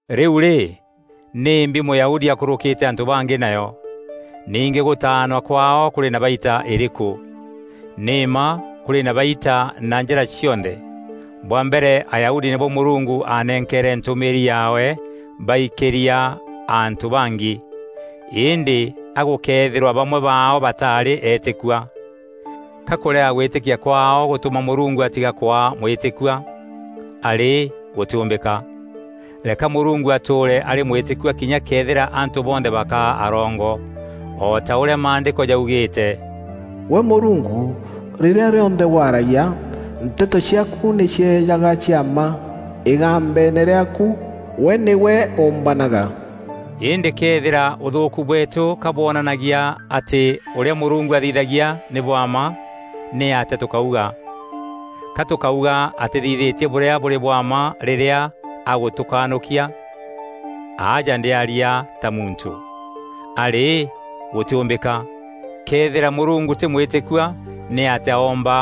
Rîu rî nîmbi Mûyahudi akûrûkîte antû bangî nayo? Ningî gûtaanwa kwaao kûrî na baita îrîkû? Nî mma kûrî na baita na njîra cionthe. Bwa mbere Ayahudi nîbo Mûrungu aanenkeere ntûmîîri yaawe baikîria antû bangî. Îndî a gûkëethîrwa bamwe baao bataarî eetîkua? Ka kûrega gwîtîkia kwaao gûtûma Mûrungu atiga kwaa mwîtîkua? Arî gûtîûmbîka! Reka Mûrungu atûûre arî mwîtîkua kinya këethîra antû bonthe bakaa arongo. O ta ûrîa Maandîko jaugîîte: “Gwe Mûrungu, rîrîa rîonthe waaragia, nteto ciaaku nî cieejaga cia mma; îgambeene rîaaku, gwe nîgwe ûûmbanaga.” Îndî këethîra ûthûûku bweetû ka bwonanagia atî ûrîa Mûrungu athithagia nî bwa mma, nîatîa tûkauga? Ga tûkauga atîthithîtie bûrîa bûrî bwa mma rîrîa agûtûkanûkia? (Aja ndîaria ta muntû.) Arî gûtîûmbîka! Këethîra Mûrungu tî mwîtîkua nîatîa oomba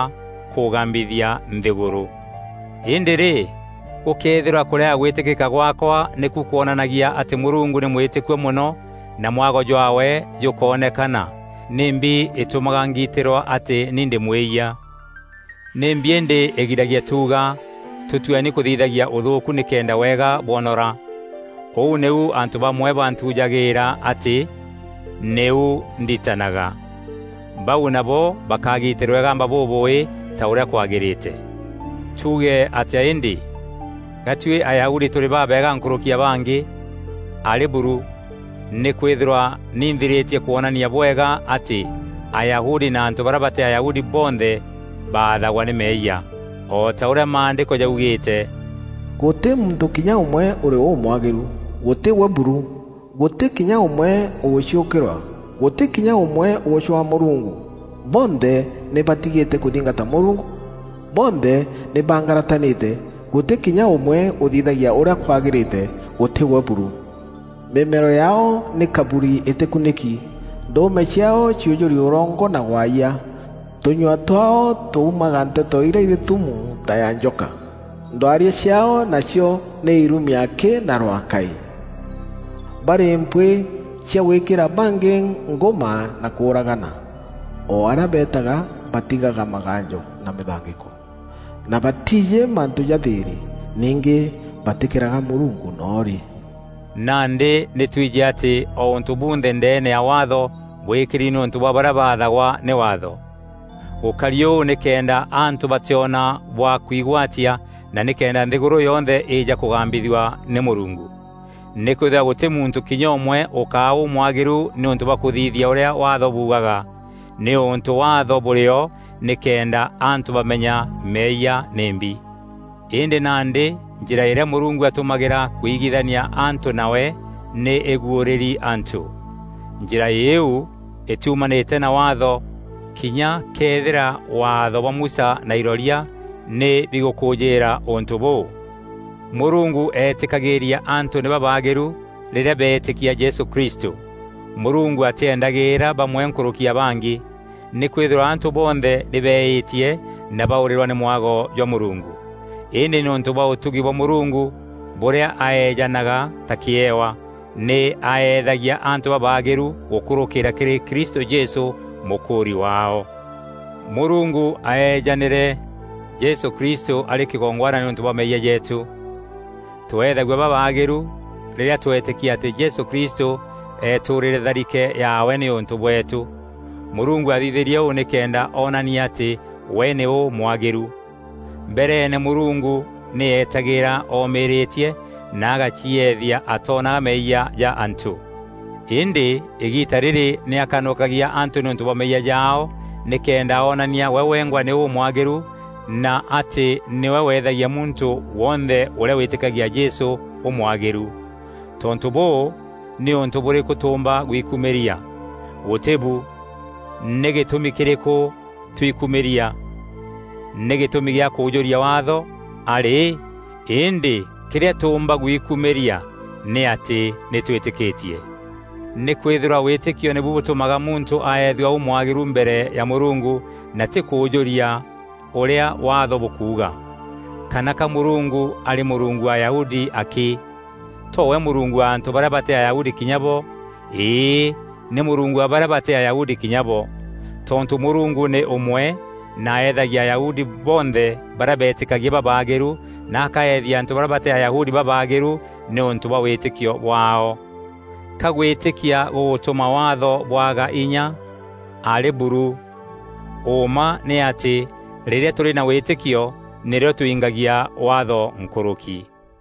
kûgambithia nthîgûrû? Îndî-rî gûkëethîrwa kûrega gwîtîkîka gwaakwa nîku kwonanagia atî Mûrungu nî mwîtîkua mono na mwago jwaawe jûkoonekana, nîmbi îtûmaga ngiitîrwa atî ni ndî mwîyia? Nîmbi îndî îgiragia tuuga, “Tûtueni kûthithagia ûthûûku nîkenda wega bwonora?” Ûu nîu antû bamwe bantujagîîra atî nîu ndîtanaga. Bau nabo bakagitîrwa îgamba bûbûûî ta ûrîa kwagîrîte! Tuuge atîa îndî? Ga tuî Ayahudi tûrî babeega nkûrûki ya bangî? Arî buru! Nîkwîthîrwa nî nthirîtie kwonania bwega atî Ayahudi na antû barîa batî Ayahudi, bonthe baathagwa nî meeyia. O ta ûrîa Maandîko jaugîîte: “Gûtî muntû kinya ûmwe ûrî ûmwagîru, gûtî we buru, gûtî kinya ûmwe ûgûciûkîrwa, gûtî kinya ûmwe ûgûcwaa Mûrungu. Bonthe nî batigîte kûthingata Mûrungu; bonthe nî bangaratanîte, gûtî kinya ûmwe ûthithagia ûrîa kwagîrîte, gûtî we buru.” “Mîmero yaao nî kaburi îtîkunîki, ndûûme ciaao ciûjûri ûrongo na waayia, tûnyua twaao tuumaga nteto irî thumu ta ya njoka. Ndwaria ciaao nacio nî irumi akî na rwaakaî. Barî mpwîî cia gwîkîra bangî ngûma na kûûragana. O arîa beetaga batigaga maganjo na mîthangîko, na batiijî mantû ja thîîrî. Ningî batîkîraga Mûrungu noo rî.” Nandî nî twijî atî o ûntû bunthe ndeene ya Waatho bwîkîri nîûntû bwa barîa baathagwa nî Waatho. Gûkari ûu nîkenda antû batîona bwa kwigwatia na nîkenda nthîgûrû yonthe îîja kûgambithua nî Mûrungu. Nîkwîthîrwa gûtî muntû kinya ûmwe ûkaa ûmwagîru nîûntû bwa kûthithia ûrîa Waatho buugaga, nîûntû Waatho bûrî o nîkenda antû bamenya meeyia nîmbi. Îndî nandî njîra îrîa Mûrungu atûmagîra kuigithania antû nawe nî îguûrîri antû. Njîra îîu îtiumanîtie na Waatho, kinya këethîra Waatho bwa Musa na iroria nî bigûkûjîîra ûntû bûû. Mûrungu eetîkagîîria antû nî babaagîru rîrîa beetîkia Jesû Kristû. Mûrungu atîendagîîra bamwe nkûrûki ya bangî. Nîkwîthîrwa antû bonthe nî beîîtie na baûrîrwa nî mwago jwa Mûrungu. Îndî nîûntû bwa ûtugi bwa Mûrungu, bûrîa aeejanaga ta kîewa, nî aeethagia antû babaagîru gûkûrûkîîra kîrî Kristû Jesû, mûkûûri waao. Mûrungu aaeejanîre Jesû Kristû arî kîgongwana nîûntû bwa meeyia jeetû. Tweethagua babaagîru rîrîa twetîkia atî Jesû Kristû eetûrîre tharike yaawe nîûntû bweetû. Mûrungu aathithîrie ûû nîkenda oonania atî we nî ûmwagîru. Mbereene Mûrungu nî eetagîîra omîrîtie na agacieethia atoonaga meeyia ja antû. Îndî îgiita rîrî nî akanûkagia antû nîûntû bwa meeyia jaao nîkenda onania we wengwa nî ûmwagîru na atî nîwe wethagia muntû wonthe ûrîa wîtîkagia Jesû, ûmwagîru. Tontû bûû, nî ûntû bûrîkû tûûmba gwikumîria? Gûtî bu! Nî gîtûmi kîrîkû twikumîria? Nî gîtûmi gîa kûûjûria Waatho? Arî! Îndî kîrîa tûûmba guikumîria nî atî nî twîtîkîtie. Nîkwîthîrwa wîtîkio nîbu bûtûmaga muntû aethua ûmwagîru mbere ya Mûrungu, na tî kûûjûria ûrîa Waatho bûkuuga. Kana ka Mûrungu arî Mûrungu wa Ayahudi akî? To we Mûrungu wa antû barîa batî Ayahudi kinya bo? Îî, nî Mûrungu wa barîa batî Ayahudi kinya bo. Tontû Mûrungu nî ûmwe, nî aeethagia Ayahudi bonthe barîa beetîkagia babaagîru na akaethia antû barîa batî Ayahudi babaagîru nîûntû bwa wîtîkio bwaao. Ka gwîtîkia gûgûtûma Waatho bwaga inya? Arî buru! Ûûma nî atî rîrîa tûrî na wîtîkio nîrîo tûingagia Waatho nkûrûki.